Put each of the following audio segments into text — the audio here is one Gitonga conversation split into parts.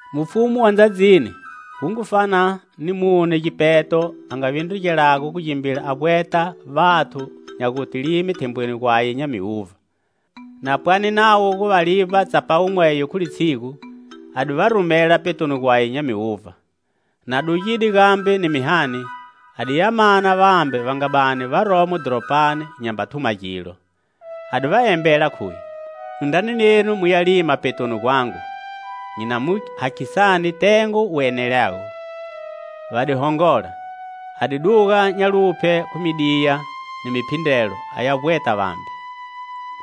"Mufumu wa ndzadzini wu ngu fana ni mune gipeto a nga vindrugelago gu gimbila a vbweta vathu nya guta lime thembweni gwaye nya miuvha. Na pwane navo gu va livba tsapawu mweyo khu litshigu, a di va rumela petoni gwaye nya miuvha. Na dugide gambe ni mihani a di ya mana vambe va nga bani varomo dhoropani nyamba thuma gilo; a di va embela, khuye: 'Indrani nenu muya lima petoni gwangu, nyi na mu hakhisani tengo wu enelago.' Va di hongola. A di duga nya luphye khu midiya ni muphindrelo aya vbweta vambe.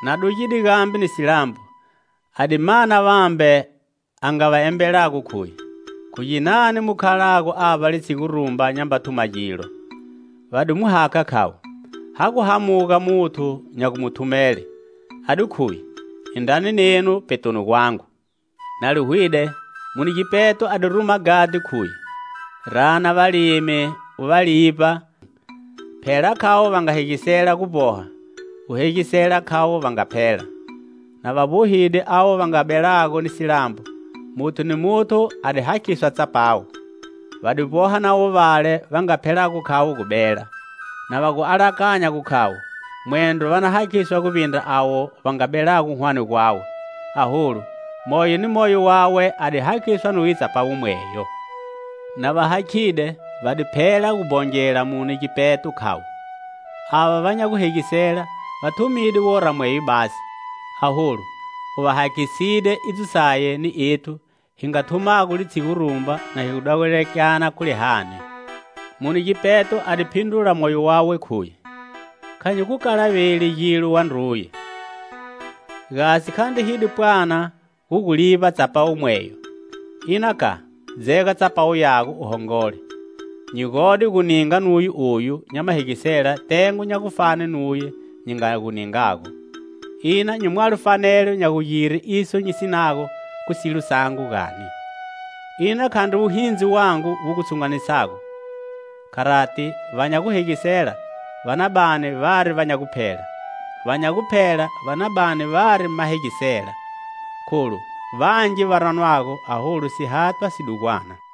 Na dugide gambe ni silambo, a di mana vambe, a nga va embelago, khuye: 'Khu ginani mu khalago avba litshigu rumba nyamba thuma gilo?' Va di mu hakha, khavo: 'Ha gu hamuga muthu nya gu mu thumele.' A di khuye: 'Indrani nenu petoni gwangu.' Na li hwide, mune gipeto a di ruma ghadhi, khuye: 'Rana valimi u va livba; phela khavo va nga hegisela gu vboha, u hegisela khavo va nga phela.' Na va vbohide avo va nga belago ni silambo, muthu ni muthu a di hakhiswa tsapawu. Va di vboha navo vale va nga phelago khavo gu bela, na va gu alakanya gu khavo mwendro va na hakhiswa guvbindra avo va nga belago hwane gwawe, aholu moyo ni moyo wawe a di hakhiswa nuye tsapawu mweyo. Na va hakhide, va di phela gu bhongela mune gipeto, khavo: 'Ava va nya guhegisela va thumide wora mweyo basi; aholu u va hakhiside idzo saye ni ethu hi nga thumago litshigu rumba na hi dahulekelana khu lihani.' Mune gipeto a di phindrula moyo wawe, khuye: 'Kha nyi gu kalaveli gilo, wandruye. Gasi khandri hi di pwana gu gu livba tsapawu mweyo? Ina ka, dzega tsapawu yago u hongole. Nyi gode gu ninga nuye oyu nya mahegisela tengo nya gufane nuye nyi nga gu ningago. Ina nyi mwalo fanelo nya gugire iso nyi sinago khu silo sangu gani? Ina khandri wuhindzi wangu wu gu tshunganedzisago?' Kharati, va nya guhegisela va na bani vari va nya guphela; va nya guphela va na bani vari mahegisela. Kholu vangi va ranwago, aholu sihathwa si dugwana."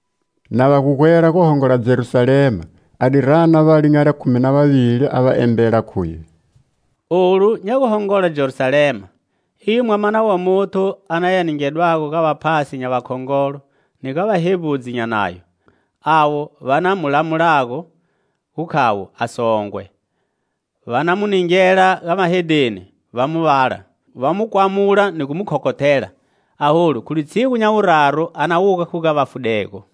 Na va ga gwela gu hongola Jerusalema, a di rana vale nya likhumi na vavili, a va embela, khuye: "Olu nya guhongola Jerusalema, iyo Mwamana wa Muthu a na ya ningedwago ga vaphasi nya vakhongolo ni ga vahevbudzi nya Nayo, avo va na lamulago gu khavo a songwe, va na mu ningela ga mahedheni va mu vala, va mu kwamula ni gu mu khokhothela. Aholu khu litshigu nya wuraru a na wuga khu ga vafudego."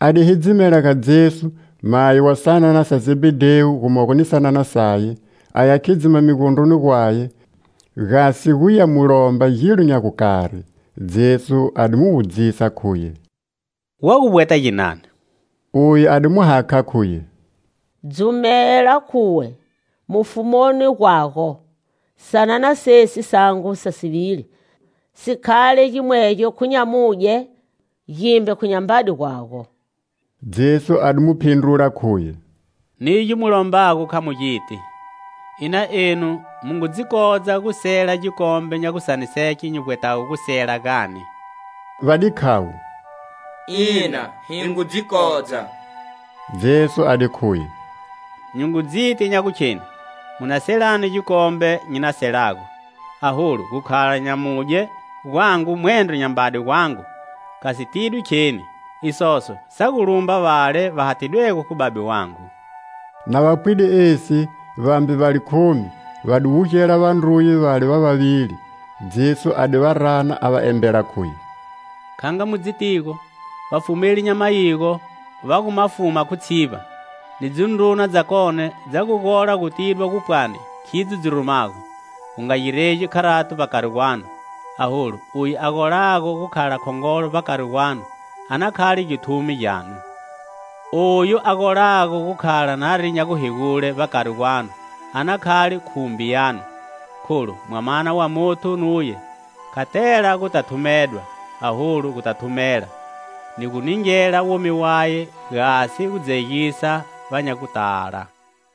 A di hidzimela ga Jesu mayi wa sanana sa Zebhedhewu gumogo ni sanana saye, aya khidzima migondroni gwaye, gasi gu ya mu lomba gilo nya gukari. Jesu a di mu wudzisa, khuye: "Wa gu vbweta ginani?" Uye a di mu hakha, khuye: "Dzumela khuwe, mufumuni gwago, sanana sesi sangu sa sivili, si khale gimwegyo khu nyamudye, gimbe khu nyambade gwago." Jesu a di mu phindrula, khuye: "Nigyo mu lombago kha mu giti. Ina enu mu ngu dzi kodza gu sela gikombe nya gusaniseke nyi vbwetago gu sela, gani?" Va di khavo: "Ina, hi ngu dzi kodza." Jesu a di khuye: "Nyi ngu dziti nya gukheni mu na selani gikombe nyi na selago; aholu gu khala nyamudye gwangu mwendro nyambade gwangu, kha si tidwi kheni; isoso sa gu lumba vale va hathidwego khu Babe wangu." Na va pwide esi, vambe va likhumi, va di wugela vandruye vale va vavili. Jesu a di va rana, a va embela, khuye: "Kha nga mu dzitigo, vafumeli nya mayigo va gu ma fuma khu tshivba; ni dzindruna dzakone dza gu gola gu tidwa nya gupwani khidzo dzi rumago. Gu nga giregi kharato vbakari gwanu. Aholu oyu a golago gu khala khongolo vbakari gwanu, a na khale githumi gyanu. Oyu a golago gu khala nari nya guhegule vbakari gwanu, a na khale khumbi yanu. Kholu Mwamana wa Muthu nuye kha tela guta thumedwa, aholu guta thumela ni gu ningela womi waye gasi gudzegisa va nya gutala."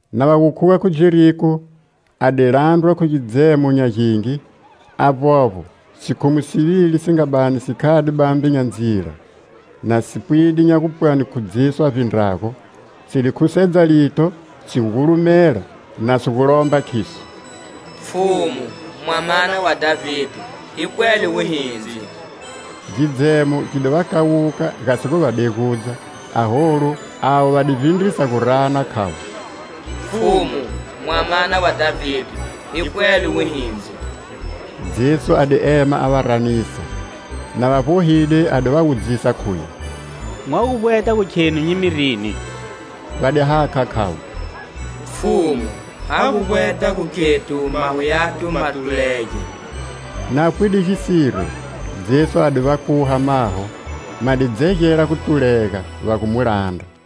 Na va gu khuga khu Jeriko, a di landrwa khu gidzemo nya gingi. Avbovbo, sikhumu sivili si nga bani si khade bambe nya ndzila, na si pwide nya gupwani khu Jesu a vbindrago, si di khusedza lito, si gulumela, na si gu lomba, khiso: "Pfhumu, Mwamana wa Dhavide, hi pwele wuhindzi!" Gidzemo gi di va kawuka, gasi gu va degudza, aholu avo va di vbindrisa gu rana, khavo: "Pfhumu, Mwamana wa Dhavide, hi pwele wuhindzi!" Jesu a di ema a va ranisa. Na va vbohide, a di va wudzisa, khuye: "Mwa gu vbweta khenu nyi mi rini?" Va di hakha, khavo: "Pfhumu, ha gu vbweta gu khethu maho yathu ma tulege!" Na pwide gisiro, Jesu a di va kuha maho. Ma di dzegela gu tulega, va gu mu landra.